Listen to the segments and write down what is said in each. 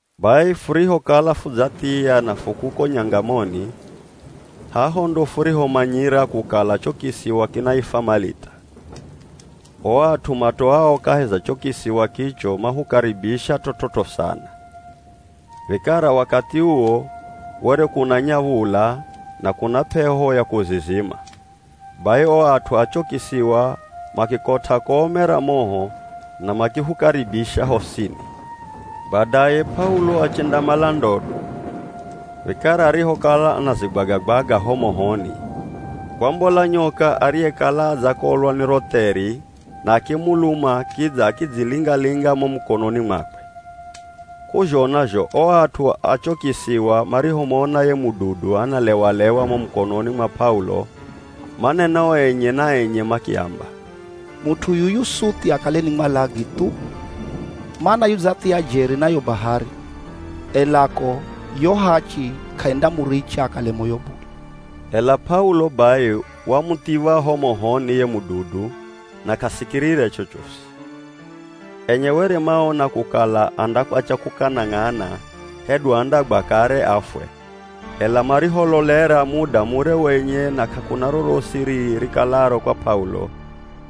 Bai furihokala fudzathiya na fu kuko nyangamoni, haho ndo furihomanyira kukala cho kisiwa kinaifwa Malita. O at'u matoao kahi za cho kisiwa kicho mahukaribisha t'ot'ot'o sana. Vikara wakathi uwo were kunanya v̱ula, na kuna p'eho ya kuzizima, bai o at'u a cho kisiwa makikot'a kome ra moho na makihukaribisha hosini. Badaye P'aulo achendamala ndodo, vikara arihokala anazigwaga-gwaga ho mohoni, kwambola nyoka ariyekala adzakolwa ni ro theri na akimuluma kidza akidzilinga-linga mo mukononi mwakwe. K'uzhona zho o at'u a cho kisiwa marihomona ye mududu analewa-lewa mo mukononi mwa P'aulo manena o enye na enye makiamba, “Mut'u yuyu suthi akale ni mwalagi thu, mana yudzathia jeri na yo bahari, ela ko yo ‘Hachi’ k'aindamuricha akale moyo bule.” Ela P'aulo bai wamuthiv̱a ho mohoni ye mududu na k'asikirire chochosi. Enye were manaona kukala andakwatya kukanang'ana hedu andagwa kare afwe, ela marihololera muda mure wenye na k'akuna rorosi rii rikalaro kwa P'aulo,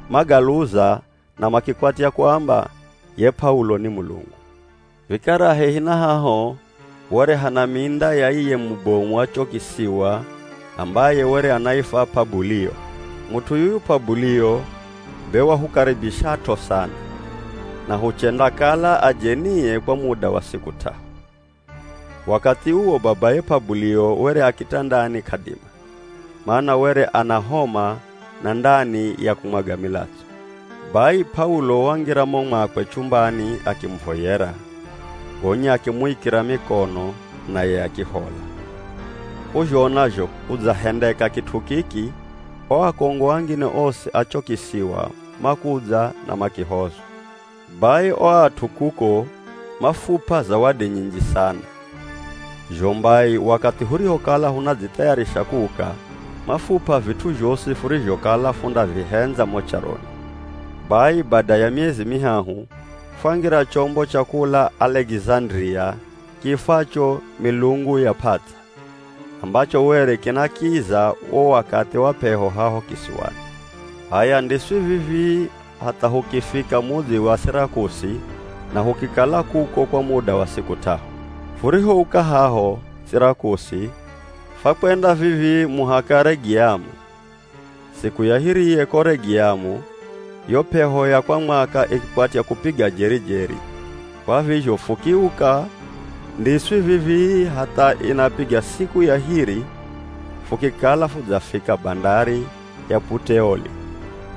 magaluza na makikwatya kuamba ye P'aulo ni mulungu. Vikara hehi na haho were hana minda ya iye mubomu wa cho kisiwa ambaye were anaifwa P'abulio. Mut'u yuyu P'abulio be wahukaribishat'o sana, na huchendakala ajenie kwa muda wa siku t'ahu. Wakathi uwo babaye P'abulio were a kitandani k'adima, mana were ana homa na ndani ya kumwaga milatso. Bai P'aulo wangira mo mwakwe chumbani akimuvoyera, gonya akimuikira mikono naye akihola. K'uzhona zho kudzahendeka kit'u kiki, o akongo angine osi a cho kisiwa makudza na makihozwa. Bai o at'u kuko, mafup'a zawadi nyinji sana. Zho mbai, wakathi hurihokala hunadzithayarisha kuuka, mafup'a vit'u zhosi furizhokala fundavihendza mo charoni. Bai bada ya miezi mihahu, fwangira chombo cha kula Alekizandiria kiifwacho “Milungu ya P'ats'a” ambacho were kinakiza wo wakathi wa p'eho haho kisiwani. H'aya, ndiswi vivii, hatha hukifika mudzi wa Sirakusi, na hukikala kuko kwa muda wa siku t'ahu. Furihouka haho Sirakusi, fwakwenda vivii muhaka Regiamu. Siku ya hiriye ko Regiamu, yo p'eho ya kwa mwaka ikikwatya kupiga jeri-jeri, kwa vizho fukiuka, ndiswi vivii, hatha inapiga siku ya hiri fukikala fudzafika bandari ya Puteoli.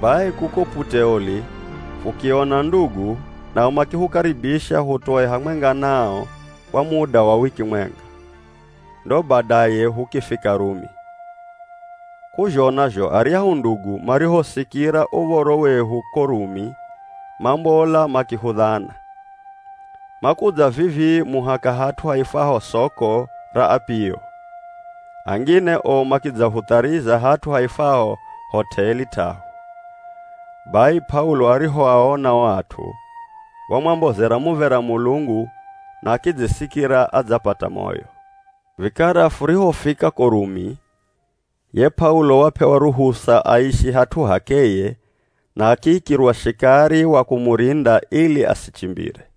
Bai kuko Puteoli fukiona ndugu nao makifukaribisha hutoe hamwenga nao kwa muda wa wiki mwenga, ndo badaye hukifika Rumi. K'uzhona zho aryahu ndugu, marihosikira uv̱oro wehu ko Rumi, mambola makihudhana. Makudza vivii muhaka hat'u haifwaho Soko ra Apio, angine o makidzahutharizira hat'u haifwaho Hot'eli T'ahu. Bai P'aulo arihoaona o at'u, wamwambozera muv̱era Mulungu na akidzisikira adzapata moyo. Vikara furihofika ko Rumi, ye P'aulo wap'ewa ruhusa aishi hat'u h'akeye na akiikirwa shikari wa kumurinda ili asichimbire.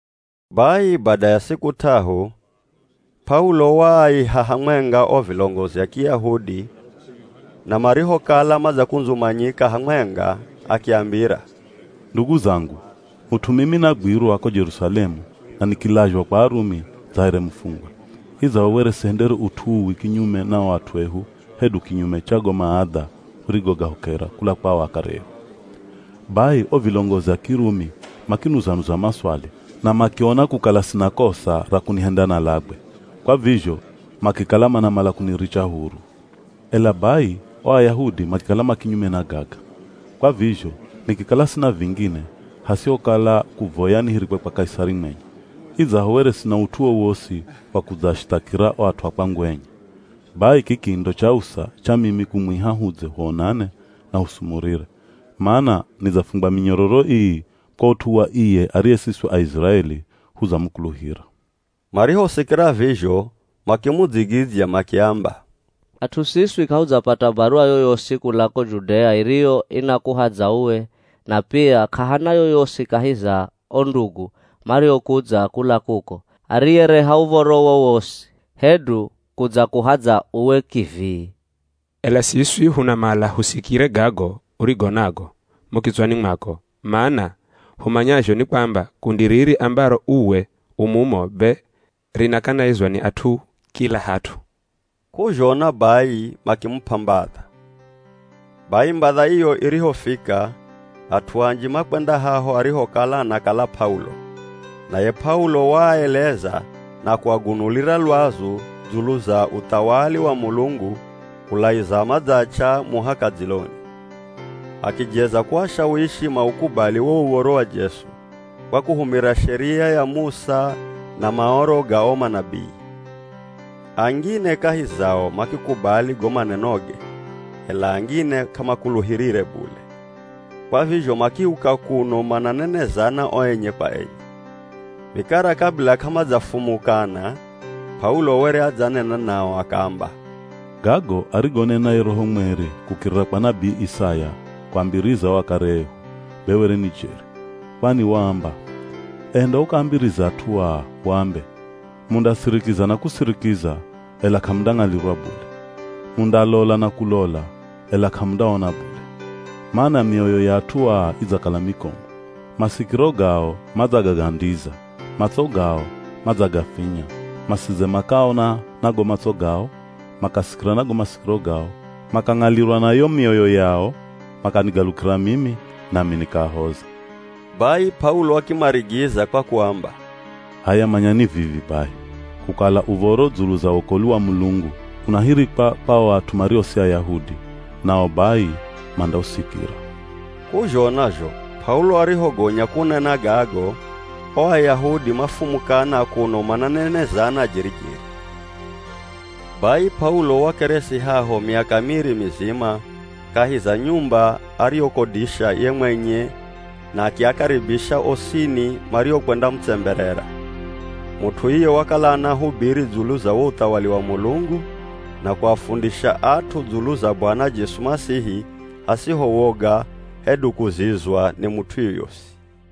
Bai bada ya siku t'ahu, P'aulo waaiha hamwenga o vilongozi a Kiyahudi na marihokala madzakundzumanyika hamwenga, akiambira, “Ndugu zangu, mut'u mimi nagwirwa ko Jerusalemu na nikilazhwa kwa Arumi dza here mufungwa, idzaho were sihendere ut'u uwi kinyume na o at'u ehu hedu kinyume cha go maadha hurigogahokera kula kwa o akare ehu. Bai o vilongozi a Kirumi makinuza-nuza maswali na makiona kukala sina kosa ra kunihenda nalagwe, kwa vizho makikala manamala kuniricha huru. Ela bai o Ayahudi makikala ma kinyume na gaga, kwa vizho nikikala sina vingine hasihokala kuvoya nihirikwe kwa Kaisari mwenye, idzaho were sina ut'u wowosi wa kudzaashithakira o at'u a kwangu enye. Bai kiki ndo chausa cha mimi kumwiha hudze huonane na husumurire, mana nidzafungwa minyororo ii kwa ut'u wa iye ariye siswi Aiziraeli hudzamukuluhira.” Marihosikira vizho makimudzigidzya makiamba, “At'u siswi k'ahudzapata baruwa yoyosi kula ko Judea iriyo inakuhadza uwe na pia k'ahana yoyosi kahi za o ndugu mariokudza kula kuko, ariyereha uv̱oro wowosi hedu kudzakuhadza uwe kivii. Ela siswi hunamala husikire gago urigo nago mo kitswani mwako, mana humanyazho ni kwamba kundi riri ambaro uwe u mumo be rinakanaizwa ni at'u kila hat'u.” K'uzhona bai, makimup'a mbadha. Bai mbadha iyo irihofika at'u anji makwenda haho arihokala anakala P'aulo, naye P'aulo waaeleza na kuagunulira lwazu dzulu za uthawali wa Mulungu kulaiza madzach'a muhaka dziloni. Akijeza kuashawishi maukubali wo uv̱oro wa Jesu, kwa kuhumira Sheria ya Musa na Maoro ga o manabii. Angine kahi zao makikubali go manenoge, ela angine k'amakuluhirire bule. Kwa vizho makiuka kuno mananenezana o enye kwa enye. Vikara kabila k'amadzafumukana, P'aulo were adzanena nao akaamba, “Gago arigonena ye Roho Mweri kukirira kwa nabii Isaya kuambiriza o akare ehu be were ni jeri. Kwani waamba, ‘Enda ukaambirize at'u aa, uambe: Mundasirikiza na kusirikiza, ela k'amundang'alirwa bule. Mundalola na kulola, ela k'amundaona bule. Mana mioyo ya at'u aa idzakala mikomu, masikiro gao madzagagandiza, matso gao madzagafinya, masidze makaona na go matso gao, makasikira na go masikiro gao, makang'alirwa na yo mioyo yao, makanigalukira mimi, nami nikaahoza.’” Bai P'aulo akimarigiza kwa kuamba, “H'aya manyani vivi bai, kukala uv̱oro dzulu za wokolwi wa Mulungu unahirikwa kwa o at'u mario si Ayahudi, nao bai mandausikira!” [ K'uzhona zho, P'aulo arihogonya kunena gago, o Ayahudi mafumukana kuno mananenezana jeri-jeri.] Bai P'aulo wakeresi haho miaka miri mizima kahi za nyumba ariyoikodisha ye mwenye na akiakaribisha osini mariokwendamutsemberera. Mut'u iye wakala anahubiri dzulu za wo uthawali wa Mulungu na kuafundisha at'u dzulu za Bwana Jesu Masihi hasiho woga hedu kuzizwa ni mut'u yoyosi.